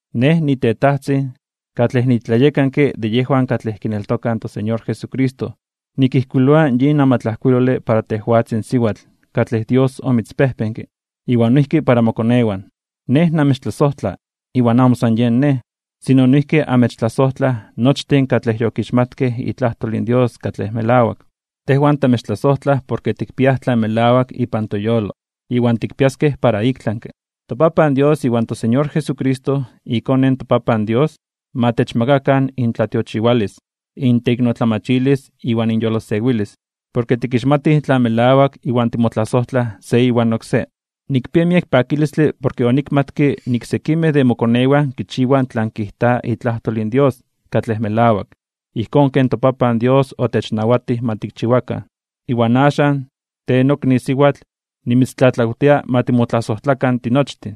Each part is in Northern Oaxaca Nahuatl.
Nej, nitetajtzin, katlej nitlayekanke de yejwan katlej kineltokaj in toSeñor Jesucristo, nikijkuiloa yin amatlajkuilole para tejwatzin siwatl katlej Dios omitzpejpenke, iwan noijki para mokonewan. Nej namechtlasojtla, iwan amo san yen nej, sino noijki amechtlasojtlaj nochtin katlej yokixmatkej itlajtol in Dios katlej melawak. Tejwan tamechtlasojtlaj porke tikpiaj tlan melawak ipan toyolo, iwan tikpiaskej para iktlanke (ik tlami). ToPapan Dios iwan toSeñor Jesucristo, iKone in toPapan Dios, ma techmakakan intlatiochiwalis, inteiknotlamachilis iwan inyolosewilis, porke tikixmatij tlan melawak iwan timotlasojtlaj se iwan oksé. Nikpia miek pakilistle porke onikmatke nik sekimej de mokonewan kichiwaj tlan kijta itlajtol in Dios katlej melawak, ijkón ken toPapan Dios otechnawatij ma tikchiwakan. Iwan axan, tej nokni siwatl, nimitztlatlawtia ma timotlasojtlakan tinochtin.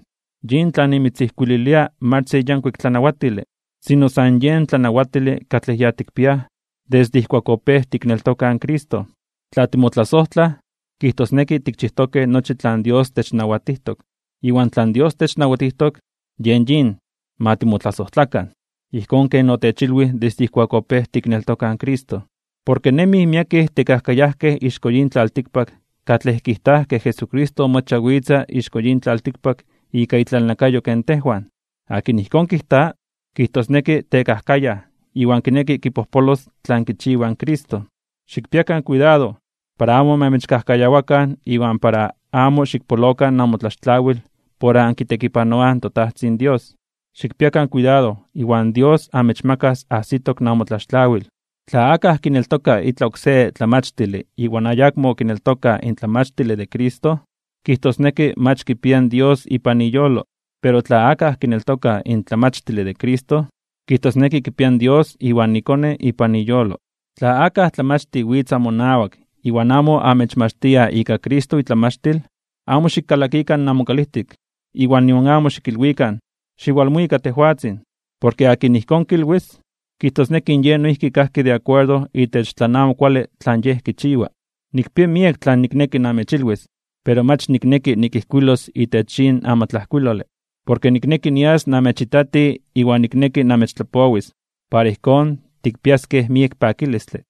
Yin tlan nimitzijkuililia mach se yankuik tlanawatile, sino san yen tlanawatile katlej ya tikpiaj desde ijkuak opéj tikneltokaj in Cristo. Tla timotlasojtlaj, kijtosneki tikchijtokej nochi tlan Dios technawatijtok. Iwan tlan Dios technawatijtok, yen yin: ma timotlasojtlakan, ijkón ken otechilwij desde ijkuak opéj tikneltokaj in Cristo. Porke nemij miekej tekajkayajkej ixko yin tlaltikpak katlej kijtaj ke Jesucristo mach owitza ixko yin tlaltikpak ika itlalnakayo ken tejwan. Akin ijkón kijta, kijtosneki tekajkayaj iwan kineki kipojpolos tlan kichiwa in Cristo. Xikpiakan kuidado, para amo ma amechkajkayawakan iwan para amo xikpolokan namotlaxtlawil por ankitekipanoaj in toTajtzin Dios. Xikpiakan kuidado iwan Dios amechmakas ajsitok namotlaxtlawil. Tla akaj kineltoka itlaj oksé tlamachtile iwan ayakmo kineltoka in tlamachtile de Cristo, kijtosneki mach kipia in Dios ipan iyolo. Pero tla akaj kineltoka in tlamachtile de Cristo, kijtosneki kipia in Dios iwan iKone ipan iyolo. Tla akaj tlamachtij witz amonawak iwan amo amechmachtia ika Cristo itlamachtil, amo xikkalakikan namokalijtik iwan nion amo xikilwikan: “Xiwalmuika tejwatzin.” Porke akin ijkón kilwis, kijtosneki in yej noijki kajki de akuerdo itech tlan amo kuale tlan yej kichiwa. Nikpia miek tlan nikneki namechilwis, pero mach nikneki nikijkuilos itech yin amatlajkuilole. Porke nikneki nias namechitati iwan nikneki namechtlapowis, para ijkón tikpiaskej miek pakilistle.